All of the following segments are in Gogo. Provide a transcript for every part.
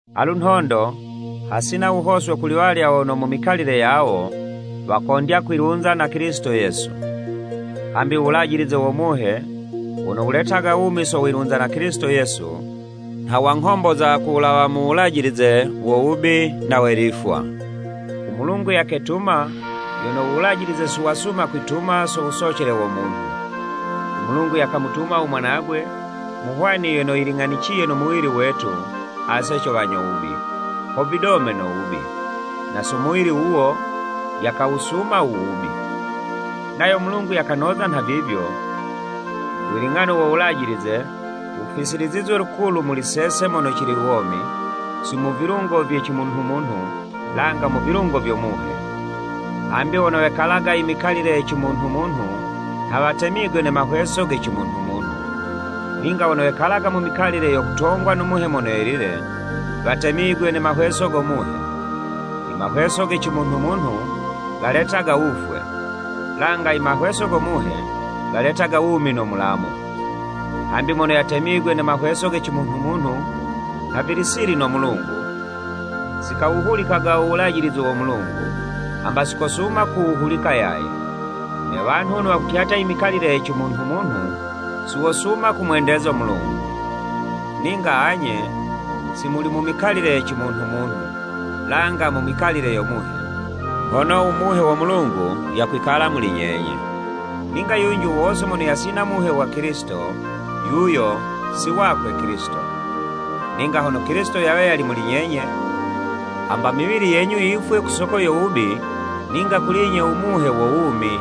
Alu nhondo hasina wuhoswe kuli walya wono mu mikalile yawo, wakondya kwilunza na Kilisito Yesu. Hambi uwulajilize wo Muhe, wono wuletaga wumi so wilunza na Kilisito Yesu, nha wanghomboza ku wulawa mu wulajilize wo wubi na we lifwa. U Mulungu yaketuma, yono u Wulajilize si wasuma kwituma so wusocele wo munhu. U Mulungu yakamutuma u mwanagwe, mu hwani yono yiling'aniye no muwili wetu ase co wanyo wubi, ho vidome no wubi, na so muwili wuwo, yakawusuma u wubi. Nayo Mulungu yakanoza nhavivyo, wiling'ano wo Wulajilize, wufisilizizwe lukulu muli sese mono cili womi, si mu vilungo vye cimunhu-munhu, langa mu vilungo vyo Muhe. Hambi wono wekalaga imikalile ye cimunhu-munhu nha watemigwe ne mahweso ge cimunhu-munhu. Ninga wono wekalaga mu mikalile yo kutongwa no Muhe Mono Yelile, watemigwe ne mahweso go Muhe. Imahweso ge cimunhu-munhu, galetaga wufwe, langa imahweso go Muhe, galetaga wumi no mulamu. Hambi mono yatemigwe ne mahweso ge cimunhu-munhu, nha vili sili no Mulungu, si kawuhulikaga u wulajilize wo Mulungu, hamba si kosuma kuwuhulika yaye. Ne wanhu wono wakutyatya i mikalile ye cimunhu-munhu, si wosuma kumwendeza u Mulungu. Ninga anye, si muli mu mikalile ye cimunhu-munhu, langa mu mikalile yo Muhe, hono u Muhe wo Mulungu yakwikala muli nyenye. Ninga yunji wo wose mono yasina Muhe wa Kilisito, yuyo si wakwe Kilisito. Ninga hono Kilisito yawe yali muli nyenye, hamba miwili yenyu yifwe ku soko yo wubi, ninga kuli 'nye u Muhe, wo wumi,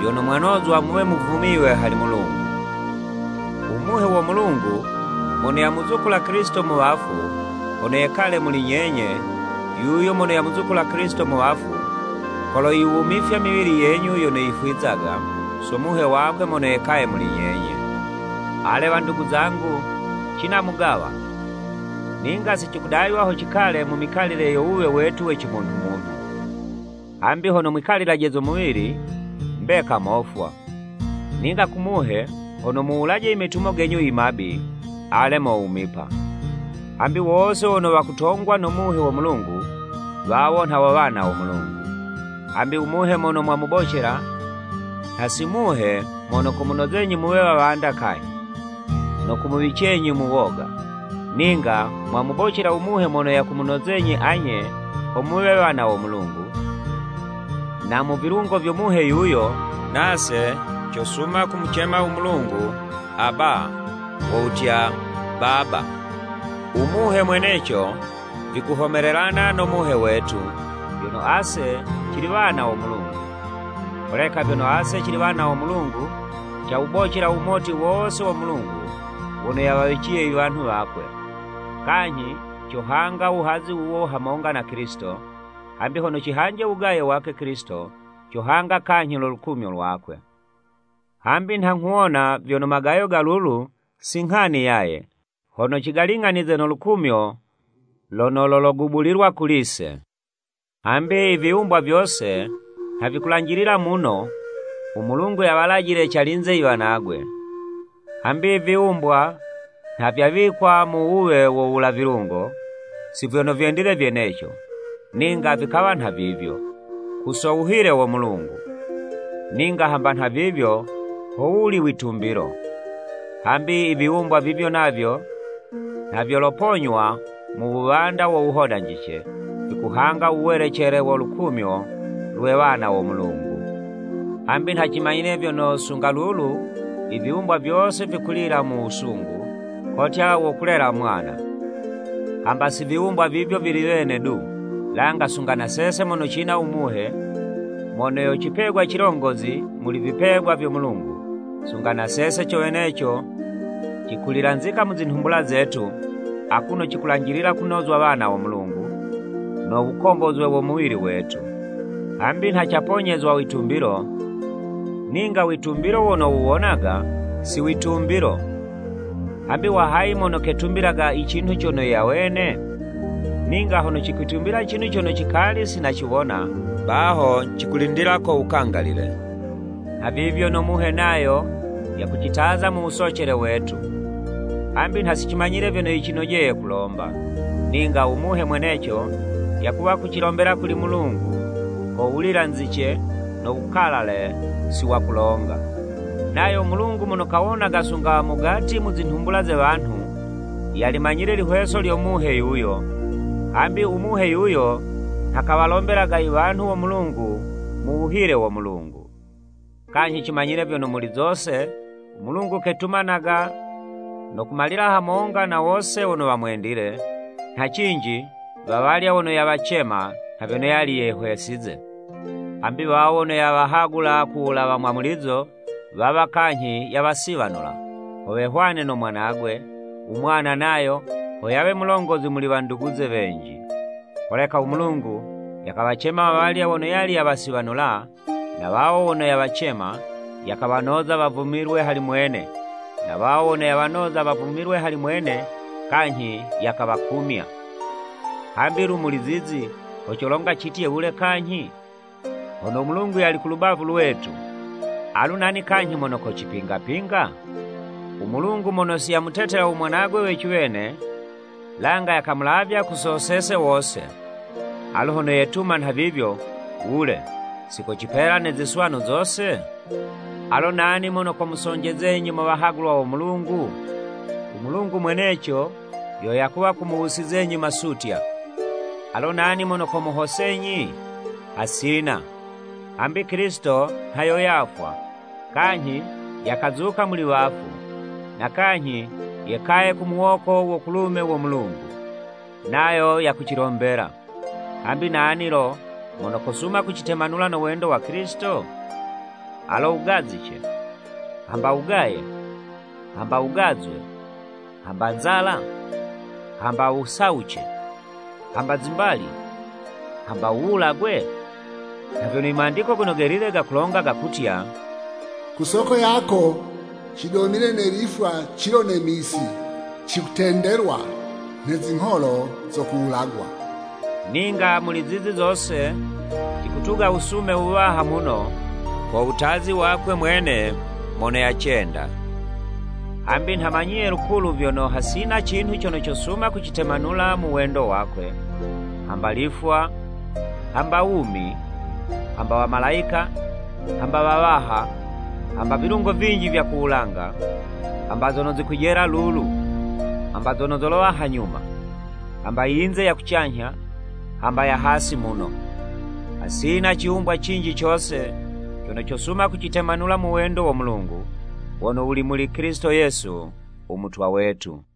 vyono mwanozwa muwe muvumiywe hali Mulungu. U Muhe wo Mulungu, mono yamuzukula Kilisito mu wafu, hono yekale muli nyenye, yuyo mono yamuzukula Kilisito mu wafu, koloyiwumifya miwili yenyu yono yifwizaga, so Muhe wakwe mono yekaye muli nyenye. Ale wandugu zangu, cina mugawa, ninga si cikudaywa ho cikale mu mikalile yo wuwe wetu we cimunhu-munhu. Hambi hono mwikalilaje zo muwili, mbeka mofwa. Ninga ku Muhe, hono muwulaje imetumo genyu imabi, ale mowumipa. Hambi wose wono watongwaga no Muhe wo Mulungu, wawo nha wo wana wo Mulungu. Hambi u Muhe mono mwamubocela, nha si Muhe mono komunozenyi muwe wawanda kanyhi, no kumuwicenyi mu woga, ninga mwamubocela u Muhe mono yakumunozenyi anye, ho muwe wana wo Mulungu, na mu vilungo vyo Muhe yuyo, nase cosuma kumucema u Mulungu, “Aba” wo wutya, “Baba.” U Muhe mweneco vikuhomelelana no muhe wetu, vyono ase cili wana wo Mulungu. Holeka vyono ase cili wana wo Mulungu, cawubocela uwumoti wose wo Mulungu wono yawawiciye iwanhu wakwe, kanyhi cohanga uwuhazi wuwo hamonga na Kilisito, hambi hono cihanje uwugaye wakwe Kilisito, cohanga kanyhi no lukumyo lwakwe. Hambi nha nghuwona vyono magayo ga lulu si nghani yaye, hono cigaling'anize no lukumyo lono lologubulilwa kuli'se. Hambi iviwumbwa vyose, nha vikulanjilila muno, u Mulungu yawalajile calinze iwanagwe. Hambi iviwumbwa nha vyawikwa mu wuwe wo wula vilungo, si vyono vyendile vyeneco, ninga vikawa nhavivyo, ku so wuhile wo Mulungu. Ninga hamba nhavivyo, ho wuli witumbilo. Hambi iviwumbwa vivyo navyo, nha vyoloponywa mu wuwanda wo wuhodanjice, vikuhanga u welecele wo lukumyo, lwe wana wo Mulungu. Hambi nha cimanyile vyono, sunga lulu iviwumbwa vyose vikulila mu wusungu, kotya wo kulela mwana. Hamba si viwumbwa vivyo vili wene du, langa sunga na sese mono cina u Muhe, mono yo cipegwa cilongozi muli vipegwa vyo Mulungu, sunga na sese co weneco cikulilanzika mu zinhumbula zetu, akuno cikulanjilila kunozwa wana wo Mulungu, no wukombozwe wo muwili wetu. Hambi nha caponyezwa witumbilo, ninga uwitumbilo wono wuwonaga, si witumbilo. Hambi wa hayi mono ketumbilaga icinhu cono yawene? Ninga hono cikucitumbila i cinhu cono cikali si naciwona, baho cikucilindila wukangalile. Nhavivyo no Muhe nayo yakucitaza mu wusocele wetu. Hambi nha si cimanyile vyono yicinojeye kulomba, ninga u Muhe mweneco, yakuwa kucilombela kuli Mulungu, ko wulilanzice no wukalale si wakulonga. Nayo u Mulungu mono kawonaga sunga mo mugati mu zinhumbula ze wanhu, yalimanyile ilihweso lyo Muhe yuyo, hambi u Muhe yuyo, nha kawalombelaga iwanhu wo Mulungu mu wuhile wo Mulungu. Kanyhi cimanyile vyono, muli zose, u Mulungu ketumanaga no kumalila hamonga na wose wono wamwendile, nha cinji, wawalya wono yawacema nha vyono yali yehwesize. Hambi wawo wono yawahagula ku wulawa mwamulizo, wawa kanyhi yawasiwanula, ho wehwane no Mwanagwe, u mwana nayo, ho yawe mulongozi muli wanduguze wenji. Holeka u Mulungu yakawacema wawalya wono yali yawasiwanula, na wawo wono yawacema, yakawanoza wavumilwe hali mwene, na wawo wono yawanoza ho wavumilwe hali mwene, kanyhi yakawakumya. Hambi lu muli zizi, ho colonga citye wule kanyhi? Hono u Mulungu yali ku lubavu lwetu, alu nani kanyhi mono kocipingapinga? U Mulungu mono si yamutetela u Mwanagwe we ciwene, langa yakamulavya ku so sese wose. Alu hono yetuma nhavivyo, wule, si kocipela ne ziswanu zose? Alo nani mono komusonjezenyi mo wahagulwa wo Mulungu? U Mulungu mweneco yo yakuwa kumuwusizenyi masutya! Alo nani mono komuhosenyi? Hasina! Hambi Kilisito nha yo yafwa, kanyhi yakazuka muli wafu, na kanyhi yekaye ku muwoko wo kulume wo Mulungu. Nayo yakucilombela. Hambi nani lo, mono kosuma kucitemanula no wendo wa Kilisito? Alo wugazice, hamba wugaye, hamba wugazwe, hamba nzala, hamba wusawuce, hamba zimbali, hamba wuwulagwe? Nha vyono i Mandiko Gono Gelile gakulonga gakutya, “Ku soko yako, cidomile ne lifwa cilo ne misi. Cikutendelwa nhe zingholo zo kuwulagwa.” Ninga muli zizi zose, cikutuga wusume wuwaha muno, ko wutazi wakwe mwene mono yacenda. Hambi nha manyiye lukulu vyono, hasina cinhu cono cosuma kucitemanula mu wendo wakwe, hamba lifwa, hamba wumi, hamba wamalayika, hamba wawaha, hamba vilungo vinji vya ku wulanga, hamba zono zikwijela lulu, hamba zono zolowa hanyuma, hamba iyinze ya kucanyha, hamba ya hasi muno. Hasina ciwumbwa cinji cose, cono cosuma kucitemanula mu wendo wo Mulungu, wono wuli muli Kilisito Yesu u Mutwa wetu.